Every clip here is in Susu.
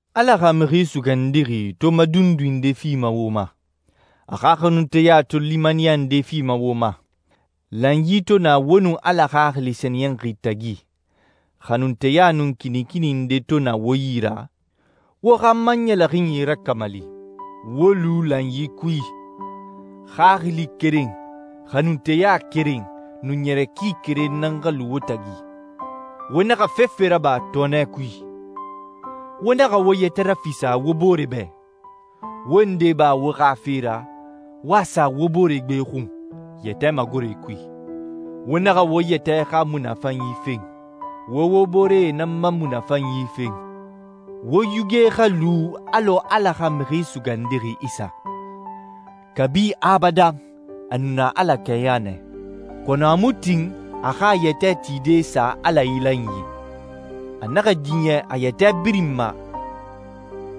Ala xa Mixi Sugandixi to madundui nde fima wo ma, a xa xanunteya to limaniya nde fima wo ma, lanyi to na wo nun Ala Xaxili Sɛniyɛnxi tagi, xanunteya nun kinikini nde to na wo yi ra, wo xa n ma ɲɛlɛxinyi rakamali. Wo lu lanyi kui. Xaxili keren, xanunteya keren, nun ɲɛrɛ ki keren nan xa lu wo tagi. Wo naxa fefe raba tɔɔnɛ kui. Wo naxa wo yɛtɛ rafisa wo booree bɛ. Wo nde ba wo xa fe ra, wo a sa wo boore gbe xun yɛtɛ magore kui. Wo naxa wo yɛtɛ xa munafanyi fen. Wo wo booree nan ma munafanyi fen. Wo yuge xa lu alɔ Ala xa Mixi Sugandixi Isa. Kabi abadan, a nu na Ala kɛɲa nɛ, kɔnɔ a mu tin a xa a yɛtɛ tide sa Ala ilanyi. A naxa diɲɛ a yɛtɛ birin ma,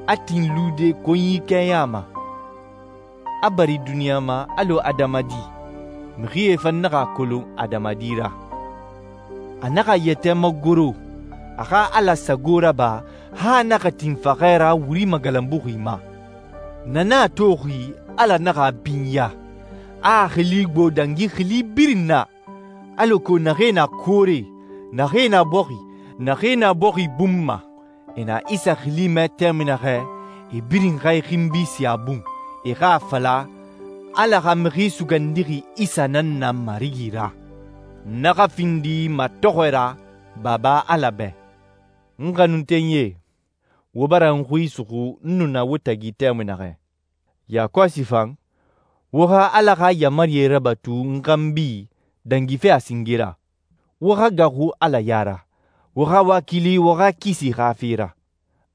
a tin lude konyi kɛɲa ma, a bari duniɲa ma alɔ adamadi, mixie fan naxa a kolon adamadi ra. A naxa a yɛtɛ magoro, a xa Ala sago raba, han a naxa tin faxɛ ra wuri magalanbuxi ma. Na nan a toxi Ala naxa a binya, a a xili gbo dangi xili birin na, alako naxee na koore, naxee na bɔxi, naxee na bɔxi bun ma, e na Isa xili mɛ tɛmui naxɛ, e birin xa e xinbi sin a bun, e xa a fala, «Ala xa Mixi Sugandixi Isa nan na Marigi ra.» Na xa findi matɔxɔɛ ra Baba Ala bɛ. N xanuntenyie, wo bara n xui suxu n nu na wo tagi tɛmui naxɛ. Yakɔsi fan, wo xa Ala xa yaamarie rabatu n xanbi dangife a singe ra. Wo xa gaaxu Ala ya ra, wo xa wakili wo xa kisi xa fe ra.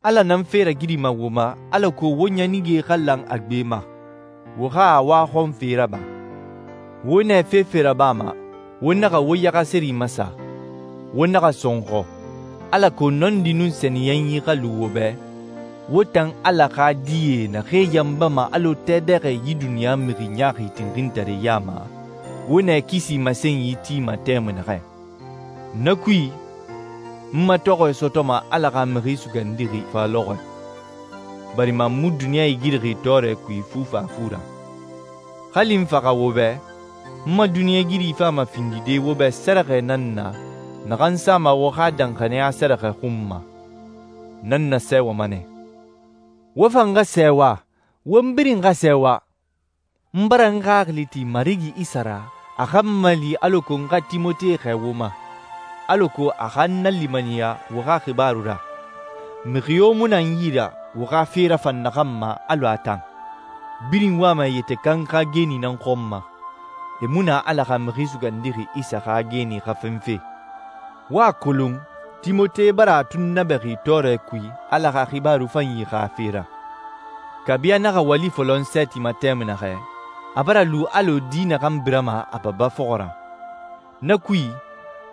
Ala nan fe ragirima wo ma alako wo ɲanige xa lan a gbe ma, wo xa a waxɔnfe raba. Wo nɛ fefe rabama wo naxa wo yaxaseri masa, wo naxa sɔnxɔ, alako nɔndi nun sɛniyɛnyi xa lu wo bɛ, wo tan Ala xa die naxee yanbama alɔ tɛ dɛxɛ yi duniɲa mixi ɲaaxi tinxintaree ya ma, wo nɛ kisi masenyi tima tɛmui naxɛ. Na kui, n matɔxɔɛ sɔtɔma Ala xa Mixi Sugandixi fa lɔxɔɛ, barima n mu duniɲa igirixi tɔɔrɛ kui fufafu ra. Hali n faxa wo bɛ, n ma duniɲɛigiri fama findide wo bɛ sɛrɛxɛ nan na naxan sama wo xa danxaniya sɛrɛxɛ xun ma. Na n nasɛɛwama nɛ. Wo fan xa sɛɛwa, won birin xa sɛɛwa. N bara n xaxili ti Marigi Isa ra a xa n mali alako n xa Timote xɛɛ wo ma, alako a xa n nalimaniya wo xa xibaaru ra. Mixi yo mu na n yi ra, wo xa fe rafan naxan ma alɔ a tan. Birin wama e yɛtɛ kan xa geeni nan xɔn ma, e mu na Ala xa Mixi Sugandixi Isa xa geeni xa fenfe. Wo a kolon Timote bara a tunnabɛxi tɔɔrɛ kui Ala xa Xibaaru Fanyi xa fe ra. Kabi a naxa wali fɔlɔ n sɛɛti ma tɛmui naxɛ, a bara lu alɔ di naxan birama a baba fɔxɔ ra. Na kui,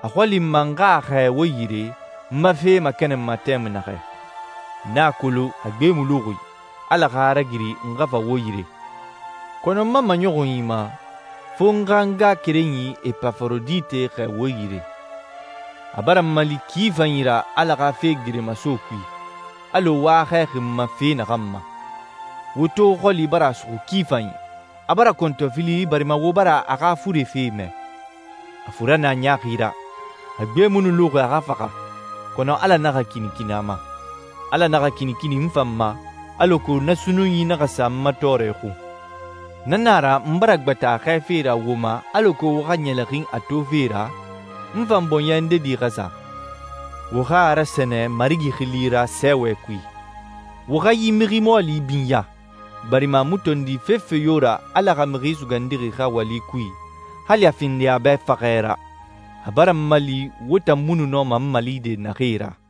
a xɔli n ma n xa a xɛɛ wo yire, n ma fe makɛnɛnma tɛmui naxɛ. N a kolon a gbe mu luxi, Ala xa a ragiri n xa fa wo yire. Kɔnɔ n ma maɲɔxunyi ma, fo n xa n ngaxakerenyi Epaforodite xɛɛ wo yire. A bara n mali ki fanyi ra Ala xa fe geremaso kui, alɔ wo a xɛɛxi n ma fe naxan ma. Wo to xɔli bara a suxu ki fanyi. A bara kɔntɔfili barima wo bara a xa fure fe mɛ. A fura nɛ a ɲaaxi ra. A gbe mu nu luxi a xa faxa, kɔnɔ Ala naxa kinikini a ma. Ala naxa kinikini n fan ma, alako na sunnunyi naxa sa n ma tɔɔrɛ xun. Na na a ra n bara gbata a xɛɛfe ra wo ma alako wo xa ɲɛlɛxin a tofe ra, n fan bɔɲɛ ndedi xa sa. Wo xa a rasɛnɛ Marigi xili ra sɛɛwɛ kui. Wo xa yi mixi mɔɔli binya, barima a mu tondi fefe yo ra Ala xa Mixi Sugandixi xa wali kui, hali a findi a bɛ faxɛ ra. A bara n mali wo tan mu nu nɔma n malide naxee ra.